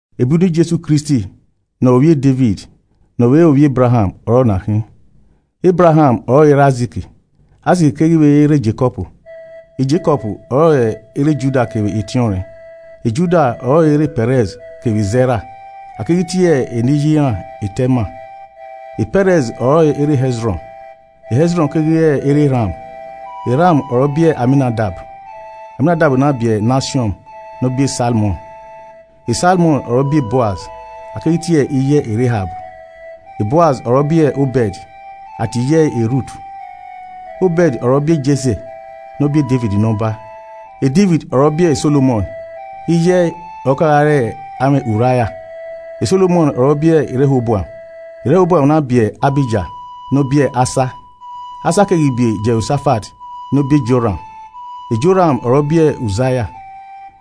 Ebe uniẹn Jesu Kristi ne ọ re ovbi Devid ne ọ vbe re ovbi Ebraham ọre ọna khin. Ebraham ọrọre erha Aizik. Aizik keghi vbe re erha Jekọb. Jekọb ọrọre erha Juda kevbe etiọnrẹn. Juda ọrọre erha Pẹrẹs kevbe Zẹra (a keghi tie eni iye iran Tema) Pẹrẹs ọrọre erha Hẹzrọn. Hẹzrọn keghi re erha Ram. Ram ọre ọ biẹ Aminadab, Aminadab na biẹ Nasiọn ne ọ biẹ Salmọn. Salmọn ọre ọ biẹ Boaz (a keghi tie iye ẹe Rehab.) Boaz ọre ọ biẹ Obẹd (a tie iye ẹe Rut) Obẹd ọre ọ biẹ Jese ne ọ biẹ Devid ne ọba. Devid ọre ọ biẹ Solomọn (iye ẹe ọre ọ kagha re amwẹ Uraia.) Solomọn ọre ọ biẹ Rehoboam, Rehoboam na biẹ Ahija ne ọ biẹ Asa. Asa keghi biẹ Jehosafat ne ọ biẹ Joran. Joran ọre ọ biẹ Uzia.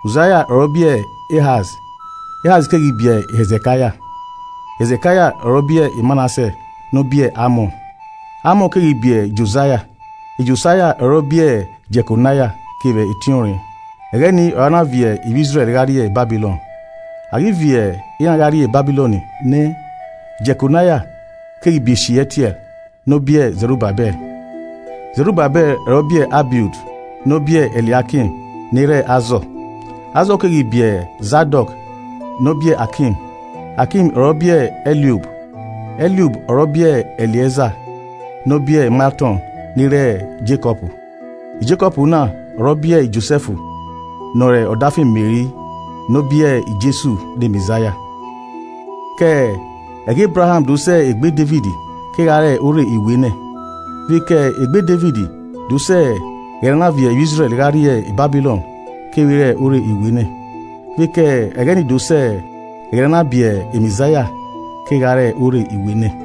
Uzaia ọre ọ biẹ Ehaz. Ehaz keghi biẹ Hẹzekaia. Hẹzekaia ọre ọ biẹ Manasẹ ne ọ biẹ Amọn. Amọn keghi biẹ Josaia, Josaia ọre ọ biẹ Jekonaia kevbe etiọnrẹn, ẹghẹ ni ọre a na viọ ivbi Izrẹl gha rrie Babilọn. A ghi viọ iran gha rrie Babilọn nẹ, Jekonaia keghi biẹ Sieatiẹl ne ọ biẹ Zerubabẹl. Zerubabẹl ọre ọ biẹ Abiud ne ọ biẹ Eliaikim ne erha Azọ. Azọ keghi biẹ Zadọk ne ọ biẹ Akim. Akim ọre ọ biẹ Eliub. Eliub ọre ọ biẹ Eleaza ne ọ biẹ Maltọn ne erha Jekọb. Jekọb na ọre ọ biẹ Josẹf ne ọre ọdafẹn e Meri ne ọ biẹ Jesu ne Mẹzaia. Ke ẹghẹ Ebraham do sẹ egbe Devid kegha re orre iwenẹ. Vbe ke egbe Devid do sẹ ẹghẹ ne a na viọ ivbi Izrẹl gha rrie Babilọn, kevbe re orre iwenẹ, vbe ke ẹghẹ ni do sẹ ẹghẹ ne a na biẹ Mẹzaia kevbe gha re orre iwenẹ.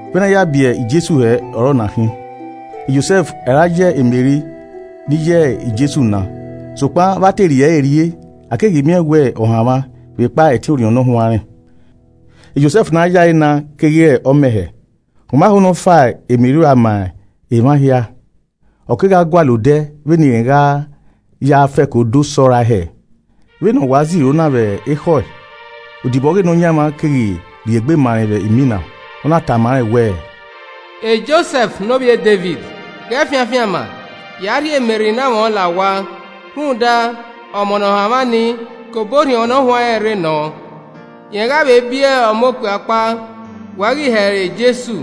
Vbene a ya biẹ Jesu hẹ ọre ọna khin. Josẹf ọre a ya Meri ne iye Jesu na. Sokpan vba te rhie ẹre rrie, a keghi miẹn wẹ ọ hanmwa vbekpa ẹtin Orhiọn Ne Ọ Huanrẹn. Josẹf ne a yae na keghi re ọmẹhẹ, ọ ma ho ne ọ fa Meri ua ma emwa hia, ọ kegha gualọ odẹ vbene irẹn gha ya fẹko do sọrae hẹ. Vbene ọ wa ziro na vbekhọe, odibo ọghe Nọyaẹnmwa keghi rhiegbe ma rẹn vbe imina, ọ na tama rẹn wẹẹ, “Josẹf ne ovbi uniẹn Devid, ghẹ fian afianma ya rhie Meri ne amwẹ ọn la owa rhunmwuda ọmọ ne ọ hanmwa ni, ke obọ Orhiọn Ne Ọ Huanrẹn rre nọ. Rẹn gha vbe biẹ ọmọ okpia ọkpa. Wẹ ghi he ẹre Jesu,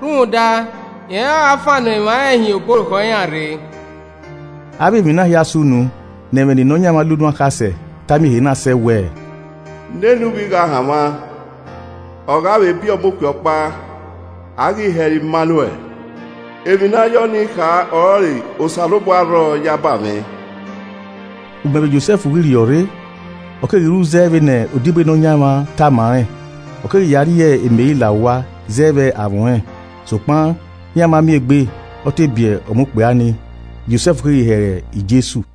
rhunmwuda rẹn ọre ọ gha fannọ emwa rẹn hin obọ orukhọ iran rre.” Avbe emwi na hia sunu ne ẹmwẹ ne Nọyaẹnmwa la unu akhasẹ ta miẹn ehe na sẹ wẹẹ, “Nene uvbi gha hanmwa, ọ gha vbe biẹ ọmọ okpia ọkpa, a ghi he ẹre Imanuẹl.” Emwi ne a ya ọnii kha ọrọre “Osanobua rrọọ yaba mwẹ.” Ugbẹn vbe Josẹf ghi rhiọrre, ọ keghi ru zẹ vbene odibo e Nọyaẹnmwa ni tama rẹn, ọ keghi ya rhie Meri la owa zẹ vbe amwẹ ọnrẹn. Sokpan iran ma miẹn egbe ọ te biẹ ọmọ okpia ni. Josẹf keghi he ẹre Jesu.